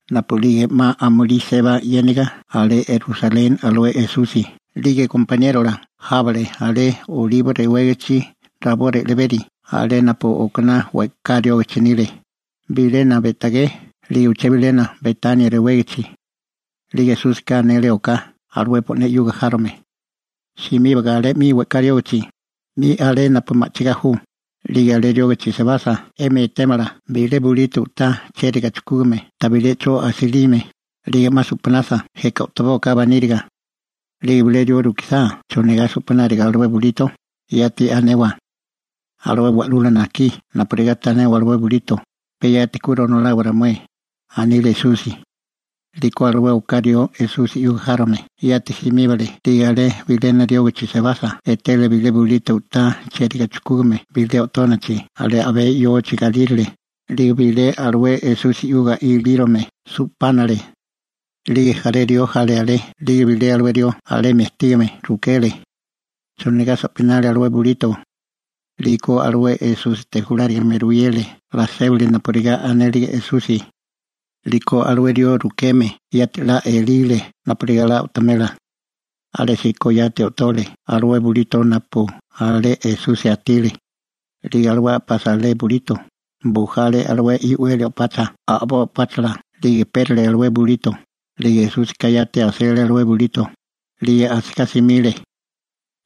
Napu'lige 'ma amulí seba 'yéniga alé Rusaleni alué Esusi 'lige gompaniérola jábale alé Olibo rewégichi rabó re'leberi, alé napu okaná we'ká riógachi nile, bilena Be'tagé 'lige uché bilena Betania rewégachi. 'Lige Esúsika anele oká alué bo'né 'yuga járome: ―Simíbaga alé 'mi we'ká riógachi, 'mi alé napu ma'chigá ju, 'lige alé riógichi sebasa, 'emi etémala bilé bulito u'tá chériga chujkúgame tabilé 'cho asilime. 'Lige 'ma su'panasa jeka o'tobóaká baníriga. 'Lige bilé rió rukisá chonigá su'panalio alué bulito, yati anewa: «Alué Wa'lula najkí napurigá tanewa ye bulito, pe yati ku ronolawa ramué», anile Esusi. 'Liko alué oká rió Esusi 'yuga járome yati simíbale 'lige alé bilénami riógichi sebasa etele bilé bulito u'tá chériga chujkúgame bilé o'tónachi alé a'bé yochi galírale, 'lige su'pánale. 'Lige jaré rió jale alé 'lige bilé alué rió alemi ajtígame rukele: ―¿Chonigá su'panaru alué bulito? 'Liko alué Esúsite julárigame ruyele 'la sébili napurigá anélige Esusi. 'Liko alué rió rukeme yati 'la elile napurigá 'la o'tomela. Alésíko yati o'tole alué bulito napu alé Esusi ajtile. 'Lige alué a'pasa alué bulito, bujale alué i'weli o'pacha a'boi o'páchala 'lige pérale alué bulito, 'lige Esúsika yati asele alué bulito, 'lige asigá simile.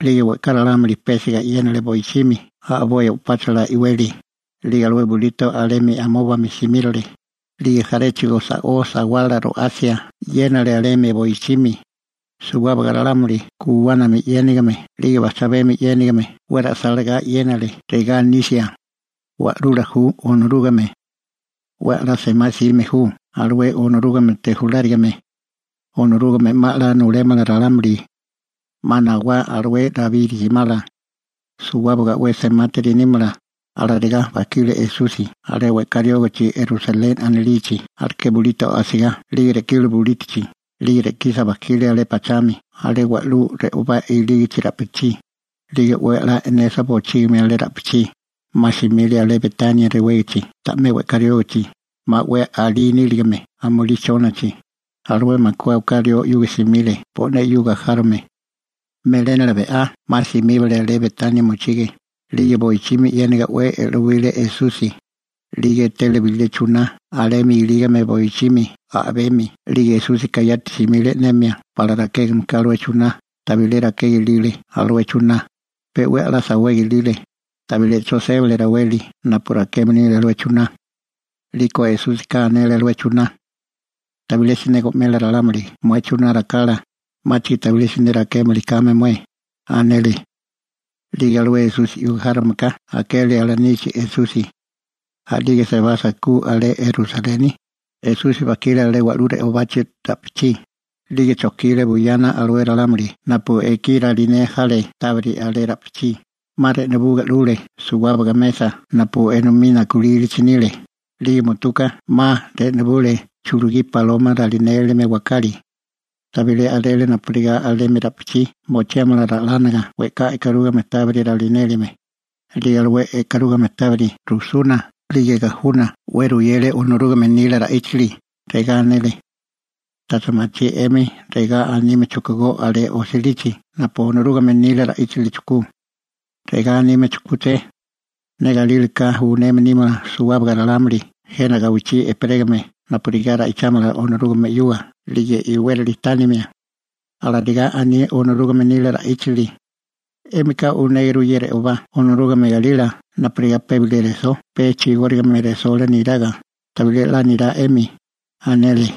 'Lige we'ká ralámuli pésiga 'yénale boichimi a'boi o'páchala i'weli, 'lige alué bulito alemi amóbami simírole, 'lige jaréchigo sa'ó sawala ro'asia e'yénale alemi boichimi. Suwábaga ralámuli guwánami 'yénigame 'lige bajchabemi 'yénigame 'we ra'sálásia 'yénale regá anisia: ―¡Wa'lula ju Onorúgame! ¡'We a'lá semá 'sime ju alué Onorúgamete julárigame! ¡Onorúgame 'ma a'lá nulémala ralámuli! ¡'Ma nawá alué Rabí rijimala! ¡Suwábaga 'we semátiri nímala! Alarigá bajkile Esusi alé we'ká riógichi Rusaleni anilichi aleké bulito asigá 'lige re'kile bulítochi 'lige re'kisa bajkile abé pachami alé wa'lú re'obá ilígichi ra'pichí, 'lige 'we a'lá e'nesa bochígimi alé ra'pichí, 'ma simile alé Betania rewégichi ta'mé we'ká riógachi, 'ma 'we alí níligame amulí chónachi, alué makué oká rió 'yuga simile bo'né 'yuga járome. Melénala be'á 'ma simíbale alé Betania mochige, 'lige boichimi e'yéniga 'we e'lowile Esusi. 'Lige etele bilé chuná alemi ilígame boichimi a'bemi 'lige Esúsika yati simile e'nemia pala rakégame ka alué chuná, tabilé rakega ilile alué chuná, pe 'we a'lá sawega ilile, tabilé 'cho sébale raweli napu rakeme nile alué chuná.» 'Liko Esúsika anele alué chuná: ―Tabilé siné go'mela ralámuli mué chuná rakala, 'máchigo tabilé siné rakémili kame mué ―anele. 'Lige alué Esusi 'yuga járomeka akele alanichi Esusi. A'lige sebasa ku alé Rusaleni, Esusi bajkile alé wa'lú re'obachi ra'pichí, 'lige chojkile buyana alué ralámuli napu ekí ralinea jale 'lige tábiri alé ra'pichí, 'ma re'nubuga 'lule suwábaga mesa napu enomí nakulílichi nile, 'lige mutuka 'ma re'nubule chulugí baloma ralinélime wakali. Tabilé a'rele napurigá alemi ra'pichí mochiámala ra'lánaga we'ká e'karúgame tábiri ralinélime. 'Lige alué e'karúgame tábiri rujsuna 'lige gajuna 'we ruyele Onorúgame nila ra'íchili. Regá anele: ―¿Tacha machí 'emi regá anime chujkugó alé osilichi napu Onorúgame nila ra'íchili chujkú? Regá anime chujkúché: «Ne galílaká uneme nímala suwábaga ralámuli jena gawichí ejperégame napurigá ra'ichámala Onorúgame 'yuga 'lige napurigá iwérali tánamala. Alarigá aní Onorúgame nila ra'íchili. 'Émika unéguru ye re'obá Onorúgame galila napurigá pe bilé resó pe chigórigame resola niraga, tabilé 'la nirá 'emi ―anele.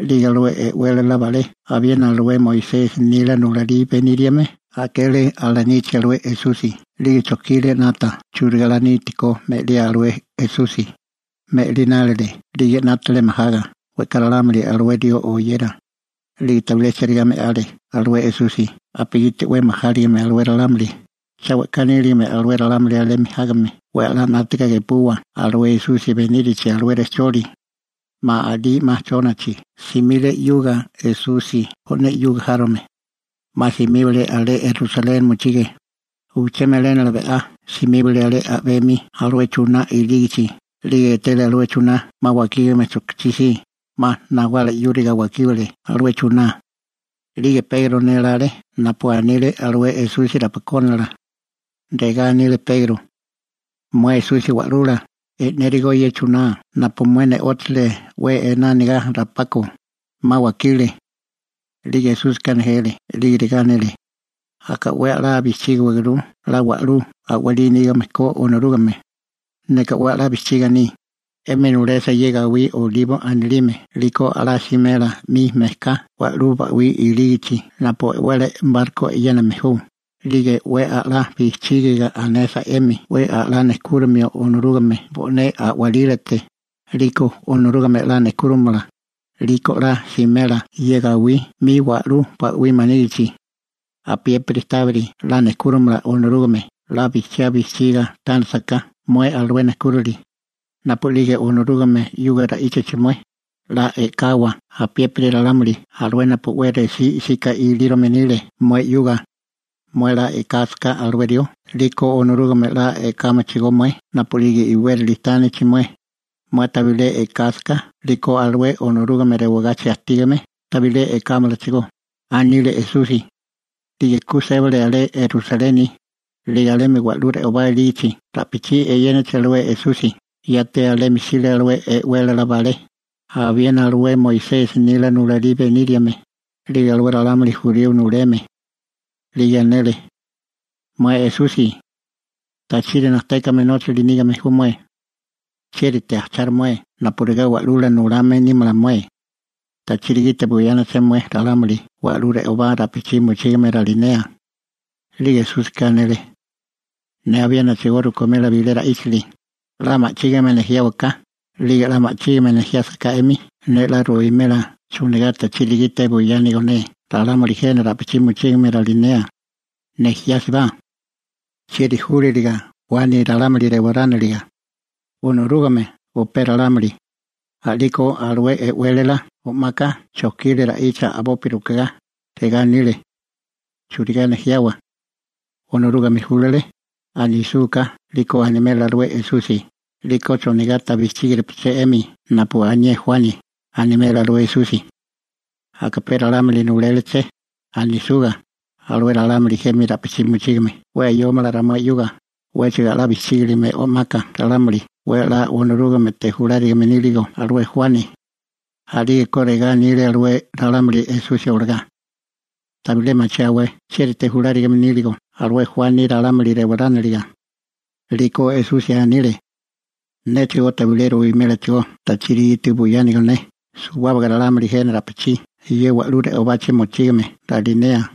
'Lige alué e'wélala balé abiena alué Moisesi nila nulalí beníriame akele alanichi alué Esusi 'lige chojkile 'nata churigá 'la nítikó me'liá alué Esusi. Me'linálile 'lige 'nátale majaga «we'ká ralámuli alué rió oyera.» 'Lige tabilé chérigá me'ale alué Esusi napugiti 'we majáligime alué ralámuli, cha we'ká níligame alué ralámuli alemi jágame 'we a'lá 'nátaga gepua alué Esusi benírachi alué rejcholi. 'Ma alí 'ma chónachi simile Esusi bo'né 'yuga járome 'yuga. 'Ma simíbale alé Rusaleni mochige. Uché melénala be'á simíbale alé a'bemi alué chuná ilígichi 'lige etele alué chuná 'ma wakígame chojkichí si, 'ma nawala 'yúriga wakíbale alué chuná. 'Lige Pegro nélále napu anile alué Esusi rapakónala. Regá anile Pegro: ―Mué Esusi Wa'lula, e'nérigo ye chuná napu mué ne'óchale 'we ená anigá rapako, 'ma wakile. 'Lige Esúsika nejele 'lige regá anele: ―Aka 'we a'lá bijchígiwaguru 'la wa'lú a'walí nígame ko Onorúgame. Neka 'we a'lá bijchiga aní, 'emi nulesa ye gawí Olibo anilime 'liko 'la simela 'mi mejká wa'lú ba'wí ilígichi napu e'wele barko e'yéname ju, 'lige 'we a'lá bijchígiga anesa 'emi 'we a'lá nejkúromio Onorúgame bo'né a'walílate, 'liko Onorúgame 'la nejkúromala, 'liko 'la simela ye gawí 'mi wa'lú ba'wí ilígichi. Apiépiri tábiri 'la nejkúromala Onorúgame 'la bijchiá bijchígiga tánasaká mué alué nejkúrili. Napu'lige Onorúgame 'yuga ra'íchachi mué, 'la e'kawa apiépiri ralámuli alué napu 'we resí 'sika ilírome nile mué 'yuga. Mué 'la e'kásaká alué rió 'liko Onorúgame 'la e'kámalachigó mué napu'lige iwérili tánichi mué. Mué tabilé e'kásaká 'liko alué Onorúgame rewagachi ajtígame tabilé e'kámalachigó ―anile Esusi. 'Lige ku sébale alé Rusaleni, 'lige alemi wa'lú re'obá ilígichi ra'pichí eyénachi alué Esusi, yati alemi jsile alué e'wélala balé, abiena alué Moisesi nila nulalí beníriame, 'lige alué ralámuli jurío nuleme. 'Lige anele: ―Mué Esusi, ¿tachiri najtékame nóchali nígame ju mué? ¿Chiérite ajcharu mué napurigá Wa'lula nulame nímala mué? ¿Tachiri gite buyánaché mué ralámuli wa'lú re'obá ra'pichí mochígame ralinea? 'Lige Esúsika anele: ―Ne abiénachigó rukimela bilé ra'íchili, 'la ma'chígame nejiáwaká, 'lige 'la ma'chígame nejiásaká 'emi ne 'la ruwimela chonigá tachiri gite buyánigo ne ralámuli jena ra'pichí mochígame ralinea. Nejiásibá: ¿Chieri júlaliga Juani ralámuli rewarániliga? ¿Onorúgame o pe ralámuli? A'liko alué e'wélala o'maka chojkile ra'icha a'bopi rukegá, regá anile: ―¿Churigá nejiawa? «Onorúgame júlale», anisúká 'liko animela alué Esusi, «'Liko ¿chonigá ta bijchígirupaché 'emi napu anié Juani?» animela alué Esusi. «Aka pe ralámuli nuléleché», anisúká, alué ralámuli jena ra'pichí mochígame 'we ayómala ramué 'yuga, 'wéchigo 'la bijchígiligame o'maka ralámuli 'we 'la Onorúgamete julárigame níligo alué Juani. A'lígeko regá anile alué ralámuli Esusi olagá: ―Tabilé machiáwé chiérite julárigame níligo alué Juani ralámuli rewarániliga. 'Liko Esusi anile: ―Néchigó tabilé ruwimélachigó tachiri gite buyánigo ne suwábaga ralámuli jena ra'pichí ye wa'lú re'obachi mochígame ralinea.